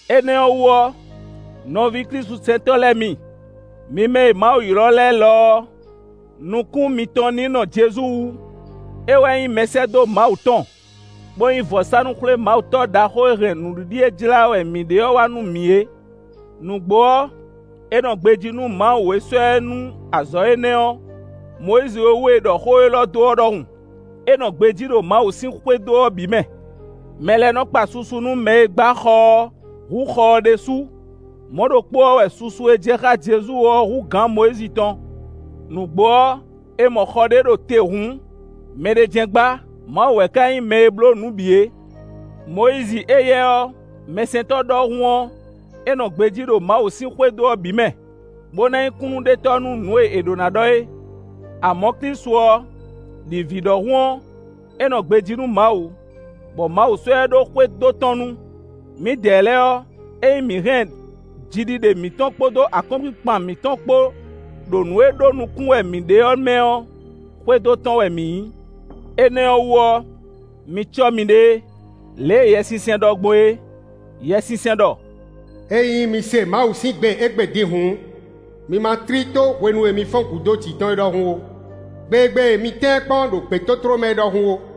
Énɛ́ ɔ́ wú ɔ́, nɔví klísusɛntɔ́ lɛ́ɛ mi, mi mɛ e Mawu ylɔ́ lɛ́ɛ lɔ ɔ́, nukún mitɔn ní nɔ Jezu wú; é wɛ nyí Mɛsɛ́dó Mawu tɔn, bó nyí vɔ̌sánú-xwlémawutɔ́ ɖaxó e hɛn nǔɖiɖi e jlá wɛ mǐ ɖe ɔ́ wá nú mǐ é. Nǔgbó ɔ́, é nɔ gbejí nú Mawu e sɔ́ ɛ nú azɔ̌ énɛ́ ɔ́, Mɔyízi e wú è ɖɔ xó élɔ́ dó ɔ́ ɖɔhun: “É nɔ gbejí ɖo Mawu sín xwédo ɔ́ bǐ mɛ.” Mɛ lɛ́ɛ nɔ kpa susu nú mɛ e gbá xɔ ɔ́ hú xɔ ɔ́ ɖésú. Mɔ̌ ɖokpó ɔ́ wɛ susu e jɛ xá Jezu ɔ́ hú gǎn Mɔyízi tɔn. Nǔgbó ɔ́, è mɔ xɔ ɖé ɖo te hǔn, mɛɖé jɛ́n gbá; Mawu wɛ ka nyí mɛ e bló nǔ bǐ é. Mɔyízi éyɛ́ ɔ́, mɛsɛntɔ́ ɖɔhun ɔ́, é nɔ gbejí ɖo Mawu sín xwédo ɔ́ bǐ mɛ, bó ná nyí kúnnuɖetɔ́ nú nǔ e è ɖǒ ná ɖɔ é. Amɔ̌ Klísu ɔ́, ɖi vǐ ɖɔhun ɔ́, é nɔ gbejí nú Mawu, bɔ Mawu sɔ́ ɛ ɖó xwédo tɔn nu. Mǐdɛɛ lɛ́ɛ ɔ́, ényí mǐ hɛn jiɖiɖe mǐtɔn kpódó akɔ́nkpinkpan mǐtɔn kpó ɖo nǔ e ɖó nukún wɛ mǐ ɖe ɔ́ mɛ ɔ́, xwédo tɔn wɛ mǐ nyí. Énɛ́ ɔ́ wú ɔ́, mi cɔ́ miɖée, lě e Yɛsinsɛn ɖɔ gbɔn é; Yɛsinsɛn ɖɔ: “Ényí mi se Mawu sín gbe égbé din hǔn, mi ma tlí tó hwenu e mi fɔ́n gǔ dó jǐ tɔn é ɖɔhun ó; gbe e gbe mi tɛ́n ɛ kpɔ́n ɖo gbětótló mɛ é ɖɔhun ó.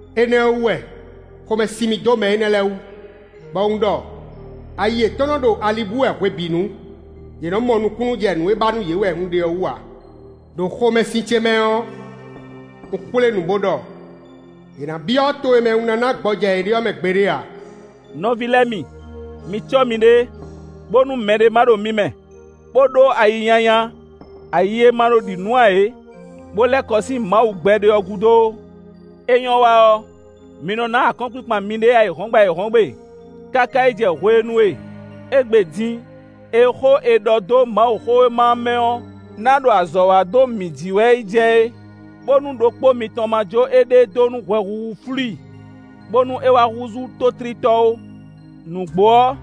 Énɛ́ ɔ́ wú wɛ xomɛ sin mì dó mɛ énɛ́ lɛ́ɛ wú, bɔ un ɖɔ: ‘Ayi yětɔn nɔ ɖo ali bú wɛ hwebǐnu. Yě mɔ nukúnnú jɛ nǔ e ba nú yě wɛ un ɖe ɔ́ wú ǎ.’ Đo xomɛsin ce mɛ ɔ́, un xwlé nǔ bó ɖɔ: ‘Yě ná byɔ́ to e mɛ un ná ná gbɔjɛ́ yě ɖe ɔ́ mɛ gbeɖé ǎ.’” Nɔví lɛ́ɛ mi, mi cɔ́ miɖée, bónú mɛɖé má ɖo mi mɛ, bó ɖó ayi nyanya, ayi e ma nɔ ɖi nǔ ǎ é, bó lɛ́ kɔ sín Mawu gbɛɖe ɔ́ gúdo ó. É nyɔ́ wa ɔ́, mi nɔ ná akɔ́nkpinkpan miɖée ayǐhɔ́ngbe ayǐhɔ́ngbe káká yi jɛ hwenu e “Égbé din” e xó è ɖɔ dó Mawuxówéma ɔ́ mɛ ɔ́ ná ɖo azɔ̌ wa dó mǐ jí wɛ yi jɛ é, bónú ɖokpó mitɔn ma jó éɖée dó nú hwɛhuhu flú i, bónú é wá húzú tótlítɔ́ ó. Nǔgbó ɔ́,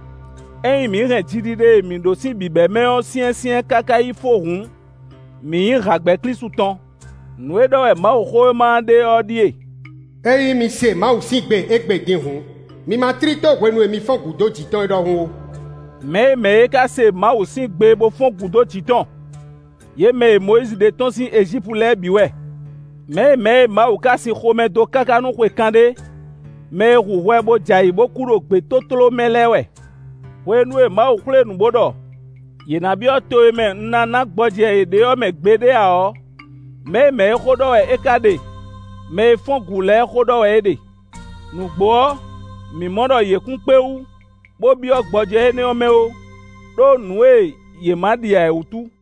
ényí mǐ hɛn jiɖiɖe e mǐ ɖó sín bǐbɛ́mɛ ɔ́ syɛ́nsyɛ́n káká yi fó hǔn, mǐ nyí hǎgbɛ́ Klísu tɔn. Nǔ e ɖɔ wɛ Mawuxówéma ɔ́ ɖe ɔ́ ɖíe: “Ényí mi se Mawu sín gbe égbé din hǔn, mi ma tlí tó hwenu e mi fɔ́n gǔ dó jǐ tɔn ɔ́ ɖɔhun ó.” Mɛ̌ e mɛ̌ e ka se Mawu sín gbe bó fɔ́n gǔ dó jǐ tɔn? Yě mɛ e Mɔyízi ɖe tɔ́n sín Ejípu lɛ́ɛ bǐ wɛ. Mɛ̌ e mɛ̌ e Mawu ka sin xomɛ dó káká nú xwe kanɖé? Mɛ e hu hwɛ, bó j'ayǐ bó kú ɖo gbětótló mɛ lɛ́ɛ wɛ. Hwenu e Mawu xwlé nǔ bó ɖɔ: “Yě ná byɔ́ to e mɛ un ná ná gbɔjɛ́ yě ɖe ɔ́ mɛ gbeɖé ǎ” ɔ́, mɛ̌ e mɛ̌ e xó ɖɔ wɛ é ka ɖe? Mɛ e fɔ́n gǔ lɛ́ɛ xó ɖɔ wɛ é ɖe. Nǔgbó ɔ́, mǐ mɔ ɖɔ yě kún kpé wú, bó byɔ́ gbɔjɛ́ énɛ́ ɔ́ mɛ ó, ɖó nǔ e yě ma ɖi ǎ é wútu.